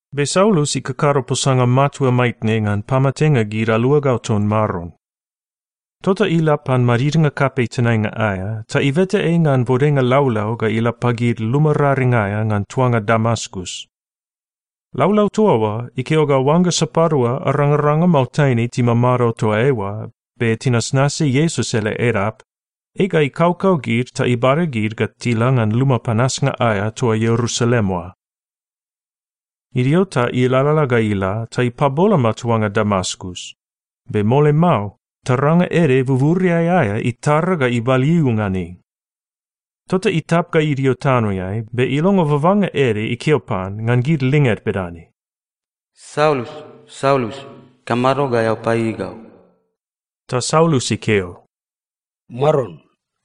Be Saulus ikakado posanga matua maitne ngan pamatenga gid aluagau ton Maron. Tota ila pan madidnga kapei tenainga aea ta ibeta ei ngan bodenga laulau ga ila pagid luma raring aea ngan tuanga Damaskus. Laulau toa oa ikeo ga oangga sapadua arangaranga mao taine timamado toa eoa, be tinasnasi Iesus ele Edap, ei ga ikaukau gid ta ibada gid ga tila ngan luma panasnga aea toa Ierusalem oa. Idio ta ilalala ga ila ta ipaboloma tuanga Damaskus, be mole mao taranga ede buburiai aea itara ga ibaliu ngan ei. Tota itap ga idio tanoeai be ilongo babanga ede ikeo pan ngan gid linged bedane, “Saulus, Saulus, ikamado ga eao paieiei gau?” Ta Saulus ikeo, “Maron,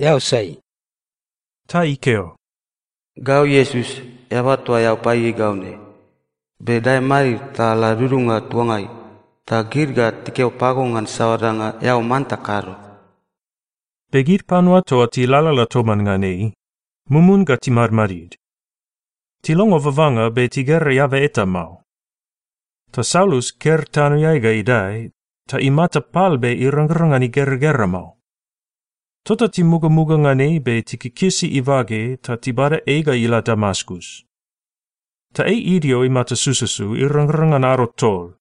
eao sai?” Ta ikeo, “Gau Iesus, eaba toa paieiei gau ne. Be dae madid ta la dudunga tuangai, ta gid ga tikeo pago ngan saoa danga eao manta kado.” Be gid panua toa tilalala toman ngan ei, mumun ga timadmadid. Tilongo babanga be tigera eaba eta mao. Ta Saulus ker tanoeai ga idae, ta imata pal be irangrang ngan igeragera mao. Tota timugamuga ngan ei be tikikisi ibage ta tibada ei ga ila Damaskus. Ta ei idio imata sususu irangrang ngan ado tol,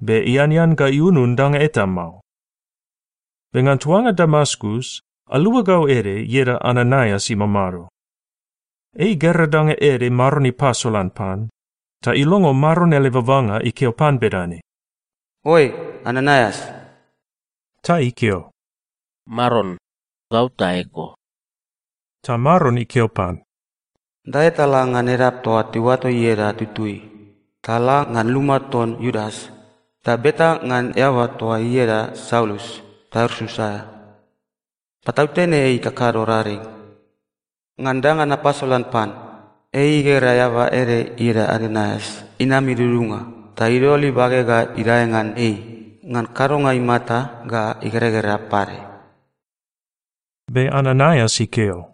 be ianean ga iunun danga eta mao. Be ngan tuanga Damaskus, aluagau ede ieda Ananaias imamado. Ei igera danga ede Maron ipasolan pan, ta ilongo Maron ele babanga ikeo pan bedane, “Oe, Ananaias!” Ta ikeo, “Maron, gau ta eko.” Ta Maron ikeo pan, “Dae ta la ngan edap toa tiuato ieda Tutui, ta la ngan luma ton Iudas, ta beta ngan eaba toa ieda Saulus Tarsus aea. Patautene ei ikakado raring. Ngan danga napasolan pan, ei igera eaba ede ieda Ananaias inam idudunga ta idol ibage ga idae ngan ei ngan kadonga imata ga igeragera pade.” Be Ananaias ikeo,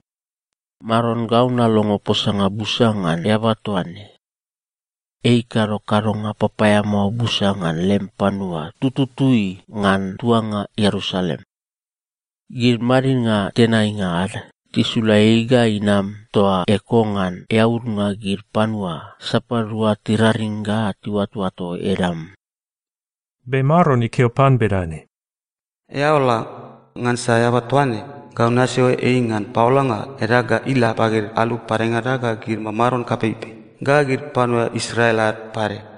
“Maron, gau nalongo posanga busa ngan eaba toa ne. Ei ikado kadonga papaeamao busa ngan lem panua tututui ngan tuanga Ierusalem. Gid madidnga tenainga ad tisula ei ga inam toa eko ngan eaudnga gid panua sapadua tiraring ga tiuatoato edam.” Be Maron ikeo pan bedane, “Eao la, ngansa eaba toa ne, gau nasio ei ngan paolanga edag ga ila pagid alu padengada ga gid mamaron kapeipei ga gid panua Israel ad pade.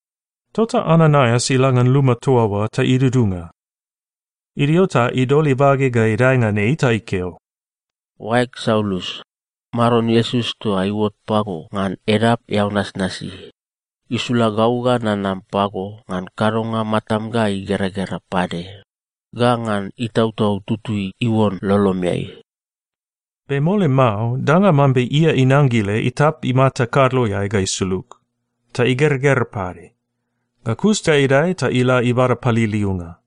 Tota Ananaias ila ngan luma toa oa ta idudunga. Idio ta idol ibage ga idae ngan ei ta ikeo, “Oaeg Saulus, Maron Iesus toa iuot pago ngan edap eao nasnasi, isula gau ga nanam pago ngan kadonga matam ga igeragera pade, ga ngan Itautau Tutui iuon lolomeai.” Be mole mao, danga mambe ia inangile itap imata kadloeai ga isulug, ta igeragera pade. Ga kus ta idae ta ila ibada paliliunga.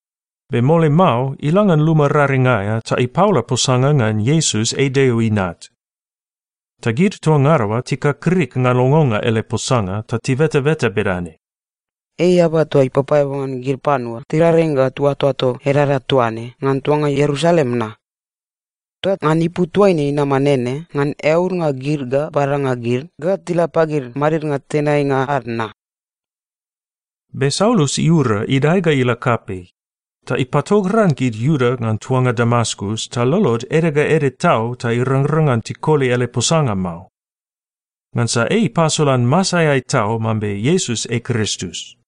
Be mole mao, ila ngan luma raring aea ta ipaola posanga ngan Iesus ei Deo Inat. Ta gid toa ngada oa tikakrik ngan longonga ele posanga ta tibetabeta bedane, “Ei eaba toa ipapaeabu ngan gid panua tiraring ga tiuatoato edaeda toa ne ngan tuanga Ierusalem na? Ta ngan ipu toaine inama nene ngan eaudnga gid ga badanga gid ga tila pagid madidnga tenainga ad na?” Be Saulus iura idae ga ila kapei, ta ipatogran gid Iuda ngan tuanga Damaskus ta lolod ede ga ede tau ta irangrang ngan tikoli ele posanga mao. Ngansa ei ipasolan masaeai tau mambe Iesus ei Kristus.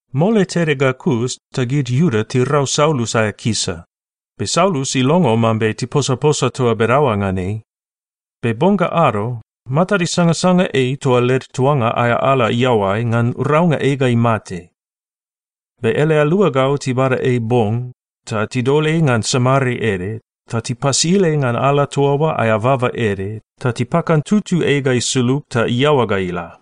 Mole tede ga kus, ta gid Iuda tirau Saulus aea kisa, be Saulus ilongo mambe tiposaposa toa bedaoa ngan ei. Be bong ga ado, matad isangasanga ei toa led tuanga aea ala iaoai ngan raunga ei ga imate. Be ele aluagau tibada ei bong, ta tidol ei ngan samare ede, ta tipasil ei ngan ala toa oa aea baba ede, ta tipakantutu ei ga isulug ta iaoa ga ila.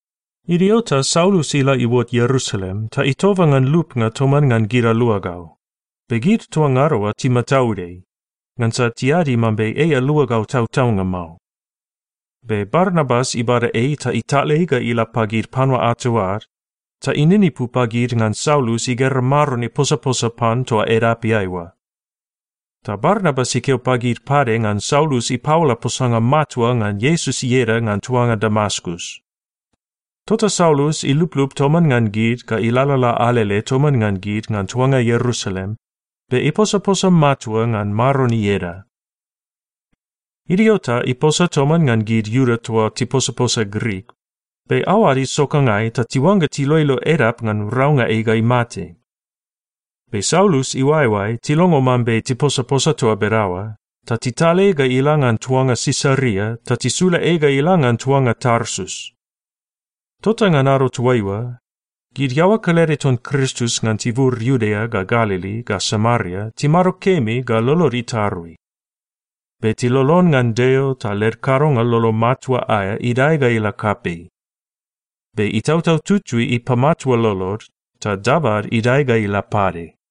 Idio ta Saulus ila iuot Ierusalem ta itoba ngan lupnga toman ngan gid aluagau, be gid toa ngada oa timataud ei, ngansa tiadi mambe ei aluagau tautaunga mao. Be Barnabas ibada ei ta ital ei ga ila pagid panua ato ad, ta ininipu pagid ngan Saulus igera Maron iposaposa pan toa edapeai oa. Ta Barnabas ikeo pagid pade ngan Saulus ipaola posanga matua ngan Iesus ieda ngan tuanga Damaskus. Tota Saulus iluplup toman ngan gid ga ilalala alele toman ngan gid ngan tuanga Ierusalem be iposaposa matua ngan Maron ieda. Idio ta iposa toman ngan gid Iuda toa tiposaposa Grik, be aoad isokangai ta tiuangga tiloilo edap ngan raunga ei ga imate. Be Saulus iuaeoae tilongo mambe tiposaposa toa bedaoa, ta tital ei ga ila ngan tuanga Sisaria ta tisula ei ga ila ngan tuanga Tarsus. Tota ngan ado toaiua, gid iaoa kelede ton Kristus ngan tibur Iudea ga Galili ga Samaria timado kemi ga lolod itarui. Be tilolon ngan Deo ta led kadonga lolo matua aea idae ga ila kapei. Be Itautau Tutui ipamatua lolod, ta dabad idae ga ila pade.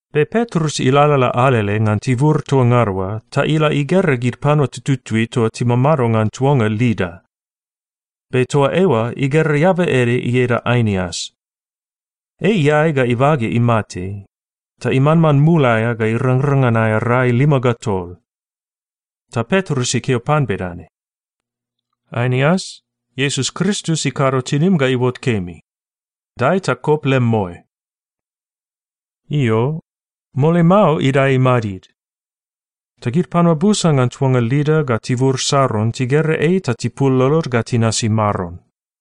Be Petrus ilalala alele ngan tibur toa ngada oa ta ila igera gid panua tututui toa timamado ngan tuanga Lida. Be toa eoa igera eaba ede ieda Ainias. Ei iae ga ibage imate, ta imanman mul aea ga irangrang ngan aea rai lima ga tol. Ta Petrus ikeo pan bedane, “Ainias, Iesus Kristus ikado tinim ga iuot kemi! Dae ta kop lem moe.” Io, mole mao idae imadid. Ta gid panua busa ngan tuanga Lida ga tibur Saron tigera ei ta tipul lolod ga tinasi Maron.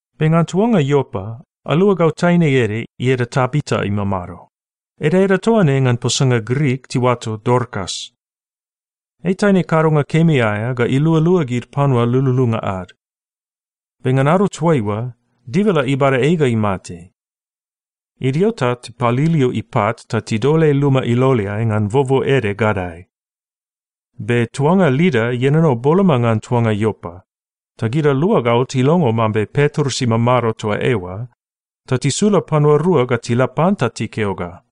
Be ngan tuanga Iopa, aluagau taine ede ieda Tabita imamado. Edaeda toa ne ngan posanga Grik tiuato Dorkas. Ei taine kadonga kemi aea ga ilualua gid panua lululunga ad. Be ngan ado toaiua, dibala ibada ei ga imate. Idio ta tipaliliu ipat ta tidol ei luma iloleai ngan bobo ede gadae. Be tuanga Lida ienono boloma ngan tuanga Iopa. Ta gid aluagau tilongo mambe Petrus imamado toa eoa, ta tisula panua rua ga tila pan ta tikeo ga,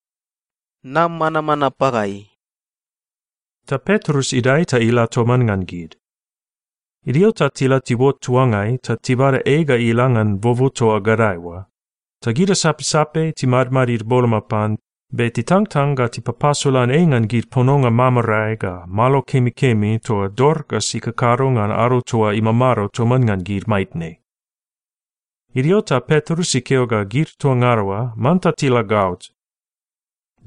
“Nam manamana pagai.” Ta Petrus idae ta ila toman ngan gid. Idio ta tila tiuot tuangai ta tibada ei ga ila ngan bobo toa gadae oa. Ta gid asapsape timadmadid boloma pan, be titangtang ga tipapasolan ei ngan gid pononga mamarae ga malo kemikemi toa Dorkas ikakado ngan ado toa imamado toman ngan gid maitne. Idio ta Petrus ikeo ga gid toa ngada oa manta tila gaot.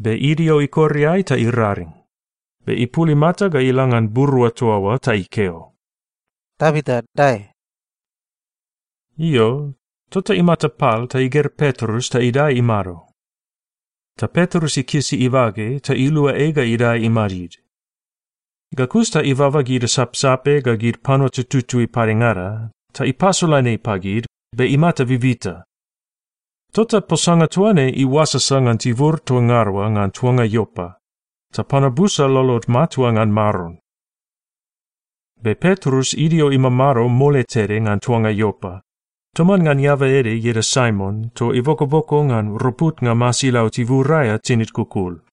Be idio ikor iae ta iraring, be ipul imata ga ila ngan burua toa oa, ta ikeo, “Tabita, dae.” Io, tota imata pal ta igera Petrus ta idae imado. Ta Petrus ikisi ibage ta ilua ei ga idae imadid. Ga kus ta ibaba gid asapsape ga gid panua tututui padengada ta ipasolan ei pagid, be imata bibita. Tota posanga toa ne iuasasa ngan tibur toa ngada oa ngan tuanga Iopa, ta panua busa lolod matua ngan Maron. Be Petrus idio imamado mole tede ngan tuanga Iopa, toman ngan eaba ede ieda Saimon toa ibokoboko ngan roputnga masilau tibur aea tinid kukul.